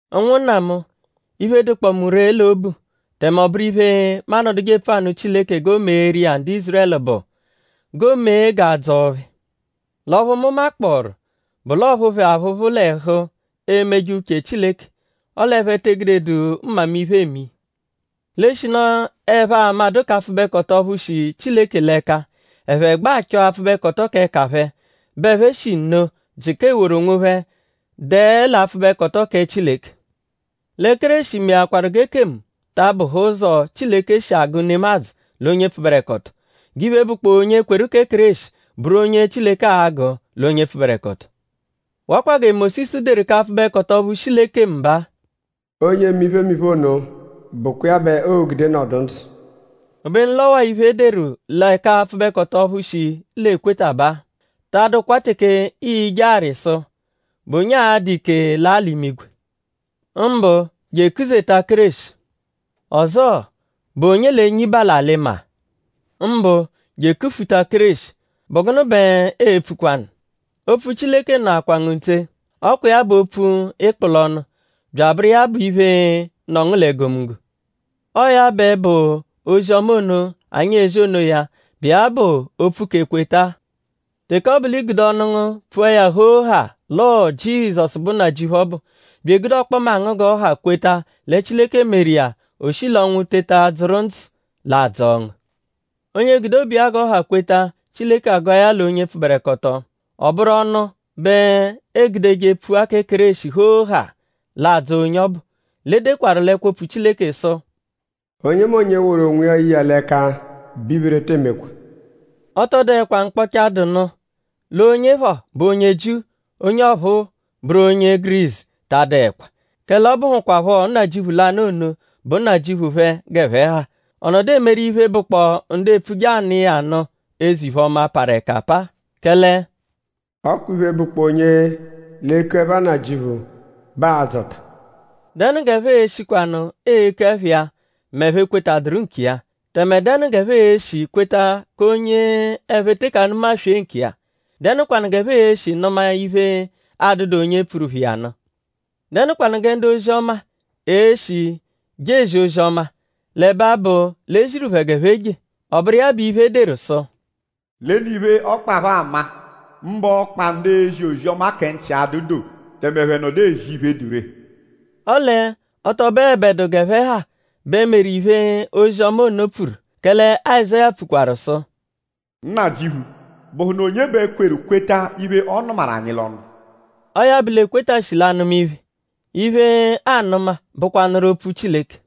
Ụnwunna mu; iphe, dụkpoo mu ree l'obu; tẹme ọ bụru iphe, mu anọduje epfu anụ Chileke g'o meeru iya ndu Ízurẹlu bụ g'o mee g'a dzọo phẹ. L'ọphu mu makpọoru bụ l'ọophu phẹ aphụphu l'ẹhu emeje uche Chileke; ọle ẹphe te egudedu mmamiphe eme iya. L'eshinu ẹphe amadụ k'apfụbekoto ọphu shi Chileke l'ẹka; ẹphe gbẹ achọ apfụbekoto k'ẹka phẹ; bẹ ẹphe shi nno jịka eworu onwophẹ dẹe l'apfụbekoto kẹ Chileke. Lẹ Kéreshi meakwaru g'ekemu ta abụhe ụzo, Chileke shi agụ nemadzụ l'onye pfụberekoto; g'iphe, bụkpoo onye kweru kẹ Kéreshi bụru onye Chileke a-gụ l'onye pfụberekoto. Wakwa gẹ Mósisu deru k'apfụbekoto ọphu shi l'ekemu baa: “Onye eme iphemiphe ono bụkwa iya bẹ oo-gude nọdu ndzụ.” Obenu l'ọ waa iphe, e deru lẹ k'apfụbekoto ọphu shi l'ekweta baa: “Ta adụkwa teke ii-je arị sụ:?Bụ onye a-dụ ike laa l'imigwe.” Mbụ je ekuzeta Kéreshi. Ọzoo; “?Bụ onye l'e-nyiba l'alị-maa?” Mbụ je ekufuta Kéreshi. ?Bụ gụnu bẹ eepfukwanu? “Opfu Chileke nọakwa ngu ntse. Ọ kwa iya bụ opfu, ịikpu l'ọnu; bya abụru iya bụ iphe, nọ ngu l'egomunggo.” Ọo ya bẹ bụ ozi-ọma ono, anyi ezi onoya, bụ iya bụ opfu k'ekweta-a. Teke ọ bụ l'i gude ọnu ngu pfua ya hoo haa l'ọo Jizọsu bụ Nnajịuphu ọbu; bya egude ọkpoma ngu g'ọ ha kweta lẹ Chileke meru iya; o shi l'ọnwu teta dzụru ndzụ; l'a dzọo ngu. Onye gude obu iya g'ọ ha kweta; Chileke agụa ya l'onye pfụberekoto; ọ bụru ọnu bẹ eegudeje pfua kẹ Kéreshi hoo haa; l'adzọ onye ọbu. L'e dekwaru l'ẹkwo-opfu Chileke sụ: “Onyemonye, woru onwiya ye iya l'ẹka bẹ iphere tee mekwa.” Ọ tọ dụekwa mkpọcha, dụ nụ. L'onye phọ bụ onye Jiu; onye ọphuu bụru onye Gurisu ta adụekwa; kẹle ọ bụhukwapho Nnajịuphu lanụ ono bụ Nnajịuphu phẹ g'ẹphe ha. Ọ nọdu emeru iphe, bụkpoo ndu epfuje anụ iya nụ eze-iphe-ọma, parụ ẹka apaa. Kẹle “ọ kwa iphe, bụkpoo onye l'eku ẹpha Nnajịuphu bẹ aa-dzọta.” ?Dẹnu g'ẹphe e-shikwanụ eku ẹpha iya m'ẹphe ekwetadụru nkiya? Tẹme?dẹnu g'ẹphe e-shi kweta k'onye ẹphe teke anụmaswee nkiya??Dẹnukwanu g'ẹphe e-shi nụma iphe, adụdu onye pfuru phẹ iya nụ? ?Dẹnukwanu gẹ ndu-ozi-ọma e-shi je ezi ozi-ọma; l'ẹbe abụ l'e ziru phẹ g'ẹphe je? Ọ bụru iya bụ iphe, e deru sụ: “Lenu iphe, ọkpa phẹ ama; mbụ ọkpa ndu ezi ozi-ọma kẹ nchi adụ doo; tẹme ẹphe nọdu ezi iphe, dụ ree.” Ọle ọ tọ bụebedu g'ẹphe ha bẹ meru iphe, ozi-ọma ono pfuru. Kẹle Azáya pfukwaru sụ: “Nnajịuphu?bụhunu onye bẹ kweru kweta iphe, ọ nụmaru anyi l'ọnu?” Ọo ya bụ l'ekweta shi l'anụma iphe. Iphe, aanụma bụkwanuru Opfu Chileke.